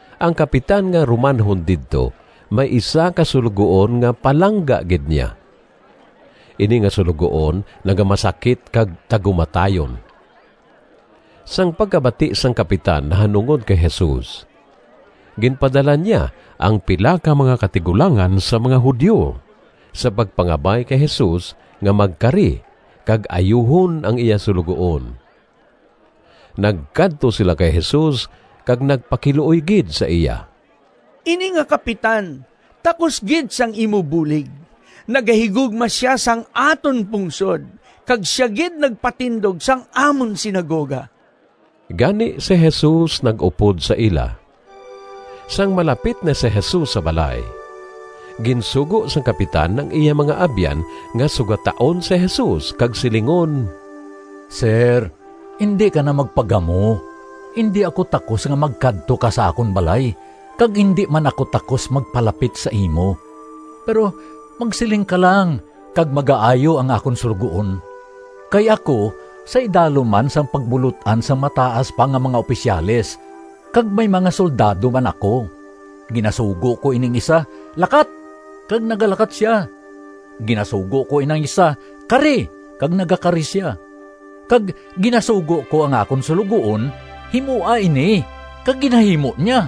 Ang kapitan nga Romanhon didto may isa ka suloguon nga palangga gid niya. Ini nga suloguon nagamasakit kag tagumatayon. Sang pagkabati sang kapitan nahanungod kay Jesus, ginpadala niya ang pila ka mga katigulangan sang mga Judio sa pagpangabay kay Jesus nga magkari kag ayuhon ang iya suloguon. Nagkadto sila kay Jesus kag nagpakiluoy gid sa iya: “Ini nga kapitan takos gid sang imo bulig. Nagahigugma sia sang aton pungsod kag sia gid nagpatindog sang amon sinagoga.” Gani si Jesus nag-upod sa ila. Sang malapit na si Jesus sa balay, ginsugo sang kapitan ang iya mga abyan nga sugataon si Jesus kag silingon, “Sir, indi ka na magpagamo! Indi ako takos nga magkadto ka sa akon balay, kag indi man ako takos magpalapit sa imo. Pero magsiling ka lang kag magaayo ang akon suloguon. Kay ako sa idalom man sang pagbulot-an sang mataas pa nga mga opisyales, kag may mga soldado man ako. Ginasugo ko ining isa, ‘Lakat!’ kag nagalakat sia. Ginasugo ko inang isa, ‘Kari!’ kag nagakari sia. Kag ginasugo ko ang akon suloguon, ‘Himoa ini!’ kag ginahimo niya.”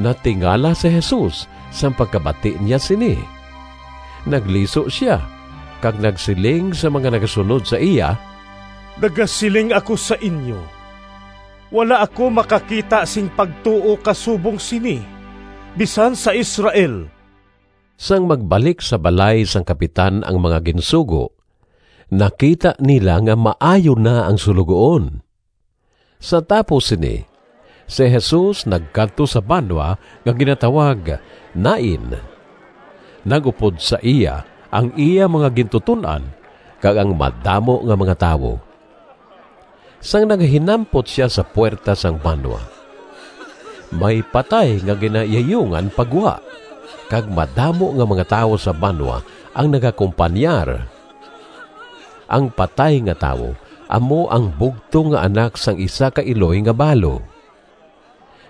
Natingala si Jesus sang pagkabati niya sini. Nagliso sia kag nagsiling sa mga nagasunod sa iya, “Nagasiling ako sa inyo, wala ako makakita sing pagtuo kasubong sini, bisan sa Israel.” Sang magbalik sa balay sang kapitan ang mga ginsugo nakita nila nga maayo na ang suloguon. Sa tapos sini, si Jesus nagkadto sa banwa nga ginatawag Nain. Nag-upod sa iya ang iya mga gintuton-an kag ang madamo nga mga tawo. Sang nagahinampot sia sa puwerta sang banwa, may patay nga ginayayungan pa gwa kag madamo nga mga tawo sa banwa ang nagakompanyar. Ang patay nga tawo amo ang bugtong nga anak sang isa ka iloy nga balo.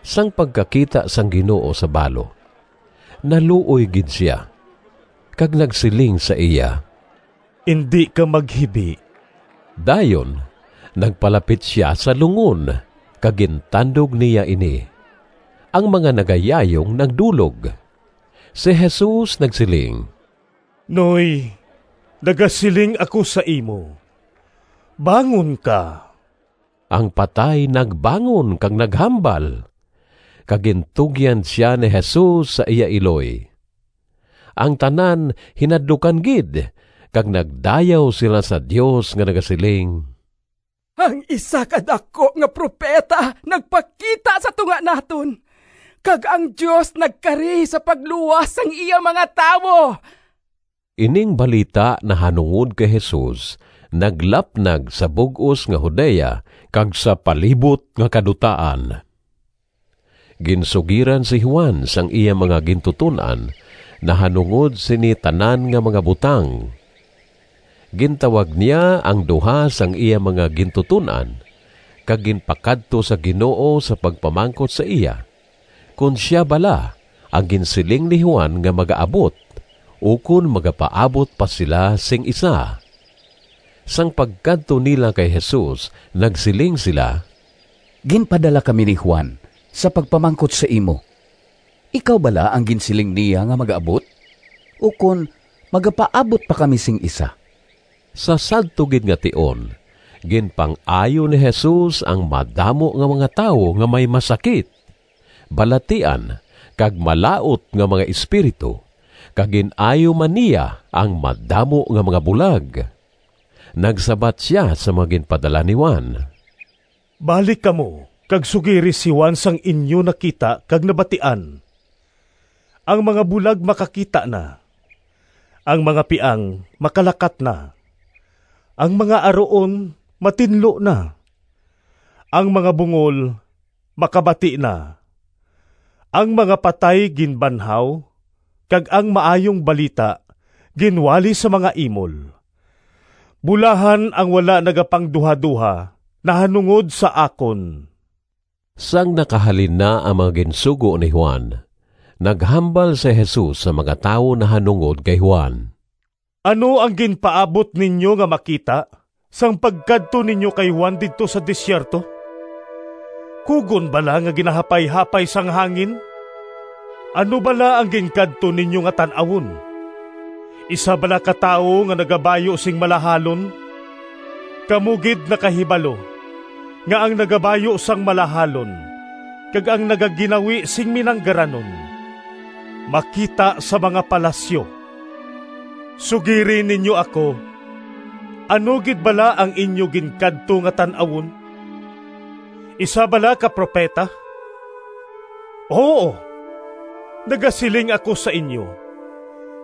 Sang pagkakita sang Ginoo sa balo naluoy gid sia kag nagsiling sa iya, “Indi ka maghibi.” Dayon nagpalapit sia sa lungon kag gintandog niya ini. Ang mga nagayayong nagdulog. Si Jesus nagsiling, “Noy, nagasiling ako sa imo, bangon ka.” Ang patay nagbangon kag naghambal, kag gintugyan sia ni Jesus sa iya iloy. Ang tanan hinadlukan gid kag nagdayaw sila sa Dios nga nagasiling, “Ang isa ka daku nga propeta nagpakita sa tunga naton, kag ang Dios nagkari sa pagluwas sang iya mga tawo.” Ining balita nahanungod kay Jesus naglapnag sa bug-os nga Judea kag sa palibot nga kadutaan. Ginsugiran si Juan sang iya mga gintuton-an nahanungod sini tanan nga mga butang. Gintawag niya ang duha sang iya mga gintuton-an kag ginpakadto sa Ginoo sa pagpamangkot sa iya kon sia bala ang ginsiling ni Juan nga magaabot ukon magapaabot pa sila sing isa. Sang pagkadto nila kay Jesus nagsiling sila, “Ginpadala kami ni Juan sa pagpamangkot sa imo, ‘Ikaw bala ang ginsiling niya nga magaabot, ukon magapaabot pa kami sing isa?’” Sa sadto gid nga tion ginpang-ayo ni Jesus ang madamo nga mga tawo nga may masakit, balatian kag malaut nga mga espiritu, kag gin-ayo man niya ang madamo nga mga bulag. Nagsabat sia sa mga ginpadala ni Juan, “Balik kamo kag sugiri si Juan sang inyo nakita kag nabatian: ang mga bulag makakita na, ang mga piang makalakat na, ang mga aruon matinlo na, ang mga bungol makabati na, ang mga patay ginbanhaw, kag ang Maayong Balita ginwali sa mga imol. Bulahan ang wala nagapangduhadoha nahanungod sa akon.” Sang nakahalin na ang mga ginsugo ni Juan, naghambal si Jesus sa mga tawo nahanungod kay Juan: “Ano ang ginpaabot ninyo nga makita sang pagkadto ninyo kay Juan didto sa desierto? Kugon bala nga ginahapayhapay sang hangin? Ano bala ang ginkadto ninyo nga tan-awon? Isa bala ka tawo nga nagabayu sing malahalon? Kamo gid nakahibalo nga ang nagabayu sang malahalon kag ang nagaginawi sing minanggaranon makita sa mga palasyo. Sugiri ninyo ako, ano gid bala ang inyo ginkadto nga tan-awon? Isa bala ka propeta? Huo, nagasiling ako sa inyo,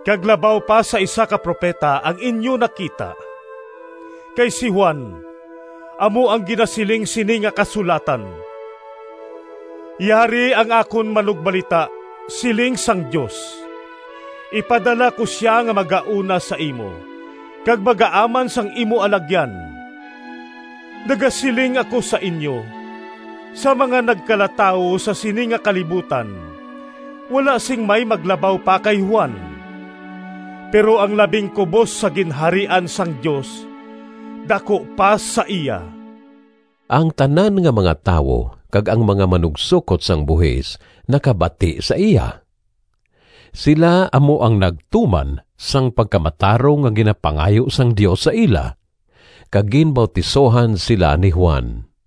kag labaw pa sa isa ka propeta ang inyo nakita. Kay si Juan amo ang ginasiling sini nga kasulatan, ‘Yari ang akon manugbalita, siling sang Dios, ipadala ko sia nga magauna sa imo kag magaaman sang imo alagyan.’ Nagasiling ako sa inyo, sa mga nagkalatawo sa sini nga kalibutan wala sing may maglabaw pa kay Juan. Pero ang labing kubos sa Ginharian sang Dios daku pa sa iya.” Ang tanan nga mga tawo kag ang mga manugsokot sang buhis nakabati sa iya. Sila amo ang nagtuman sang pagkamatarong nga ginapangayo sang Dios sa ila kag ginbautisohan sila ni Juan.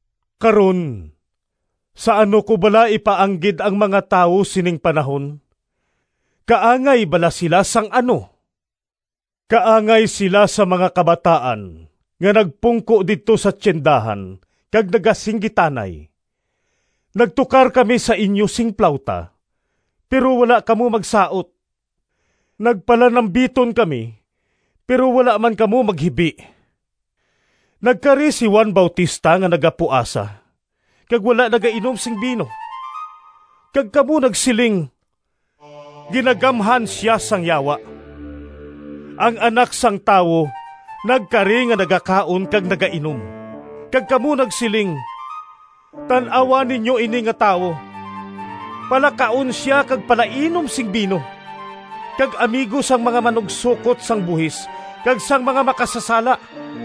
“Karon, sa ano ko bala ipaanggid ang mga tawo sining panahon? Kaangay bala sila sang ano? Kaangay sila sa mga kabataan nga nagpungko didto sa tiyendahan kag nagasinggitanay, ‘Nagtukar kami sa inyo sing plawta, pero wala kamo magsaot. Nagpanalambiton kami, pero wala man kamo maghibi.’ Nagkari si Juan Bautista nga nagapuasa kag wala nagainom sing bino, kag kamo nagsiling, ‘Ginagamhan sia sang yawa.’ Ang Anak sang Tawo nagkari nga nagakaon kag nagainom, kag kamo nagsiling, ‘Tan-awa ninyo ini nga tawo! Palakaon sia kag palainom sing bino, kag amigo sang mga manugsokot sang buhis kag sang mga makasasala!’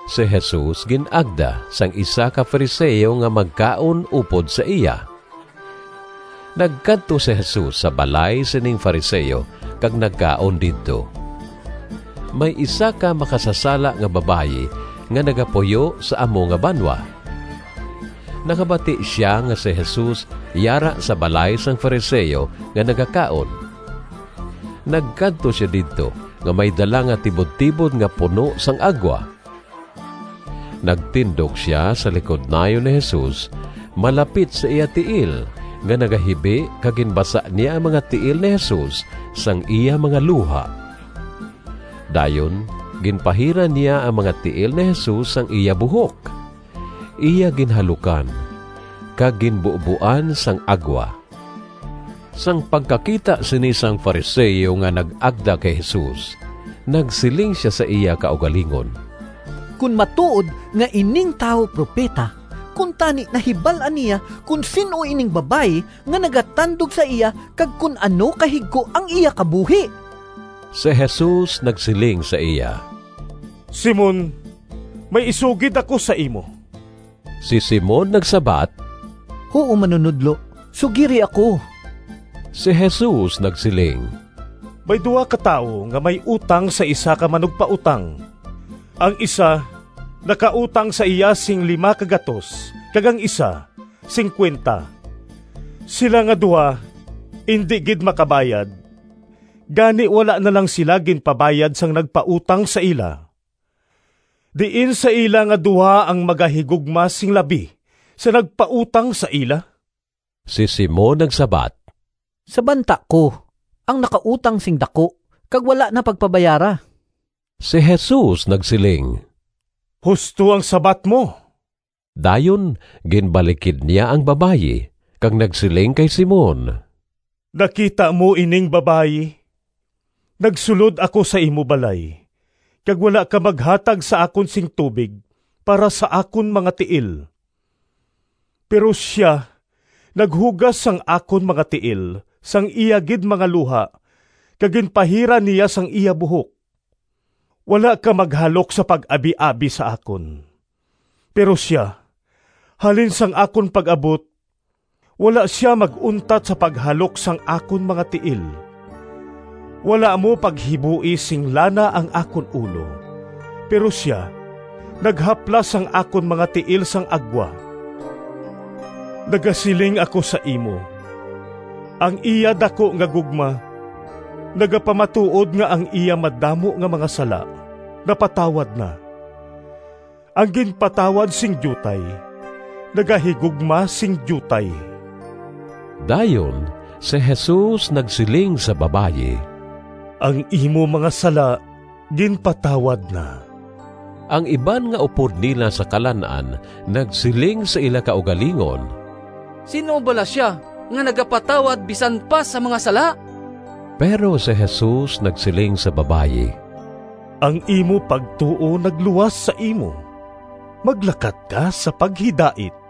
Si Jesus gin-agda sang isa ka Fariseo nga magkaon upod sa iya. Nagkadto si Jesus sa balay sining Fariseo kag nagkaon didto. May isa ka makasasala nga babayi nga nagapuyo sa amo nga banwa. Nakabati sia nga si Jesus yara sa balay sang Fariseo nga nagakaon. Nagkadto sia didto nga may dala nga tibudtibod nga puno sang agwa. Nagtindog sia sa likod nayon ni Jesus malapit sa iya tiil nga nagahibi kag ginbasa niya ang mga tiil ni Jesus sang iya mga luha. Dayon ginpahiran niya ang mga tiil ni Jesus sang iya buhok, iya ginhalukan, kag ginbuboan sang agwa. Sang pagkakita sini sang Fariseo nga nag-agda kay Jesus nagsiling sia sa iya kaugalingon, “Kon matuod nga ining tawo propeta, kuntani nahibal-an niya kon sin-o ining babayi nga nagatandog sa iya kag kon ano kahigko ang iya kabuhi.” Si Jesus nagsiling sa iya, “Simon, may isugid ako sa imo.” Si Simon nagsabat, “Huo, Manunodlo, sugiri ako.” Si Jesus nagsiling, “May duha ka tawo nga may utang sa isa ka manugpautang. Ang isa nakautang sa iya sing P500 kag ang isa P50. Sila nga duha indi gid makabayad, gani, wala na lang sila ginpabayad sang nagpautang sa ila. Diin sa ila nga duha ang magahigugma sing labi sa nagpautang sa ila?” Si Simon nagsabat, “Sa banta ko ang nakautang sing daku kag wala na pagpabayara.” Si Jesus nagsiling, “Husto ang sabat mo.” Dayon ginbalikid niya ang babayi kag nagsiling kay Simon, “Nakita mo ining babayi? Nagsulod ako sa imo balay kag wala ka maghatag sa akon sing tubig para sa akon mga tiil, pero sia naghugas sang akon mga tiil sang iya gid mga luha kag ginpahiran niya sang iya buhok. Wala ka maghalok sa pag-abiabi sa akon, pero sia halin sang akon pag-abot, wala sia mag-untat sa paghalok sang akon mga tiil. Wala mo paghiboi sing lana ang akon ulo, pero sia naghaplas sang akon mga tiil sang agwa. Nagasiling ako sa imo, ang iya daku nga gugma nagapamatuod nga ang iya madamo nga mga sala napatawad na. Ang ginpatawad sing diutay nagahigugma sing diutay.” Dayon si Jesus nagsiling sa babayi, “Ang imo mga sala ginpatawad na.” Ang iban nga upod nila sa kalan-an nagsiling sa ila kaugalingon, “Sin-o bala sia, nga nagapatawad bisan pa sang mga sala?” Pero si Jesus nagsiling sa babayi, “Ang imo pagtuo nagluwas sa imo. Maglakat ka sa paghidait.”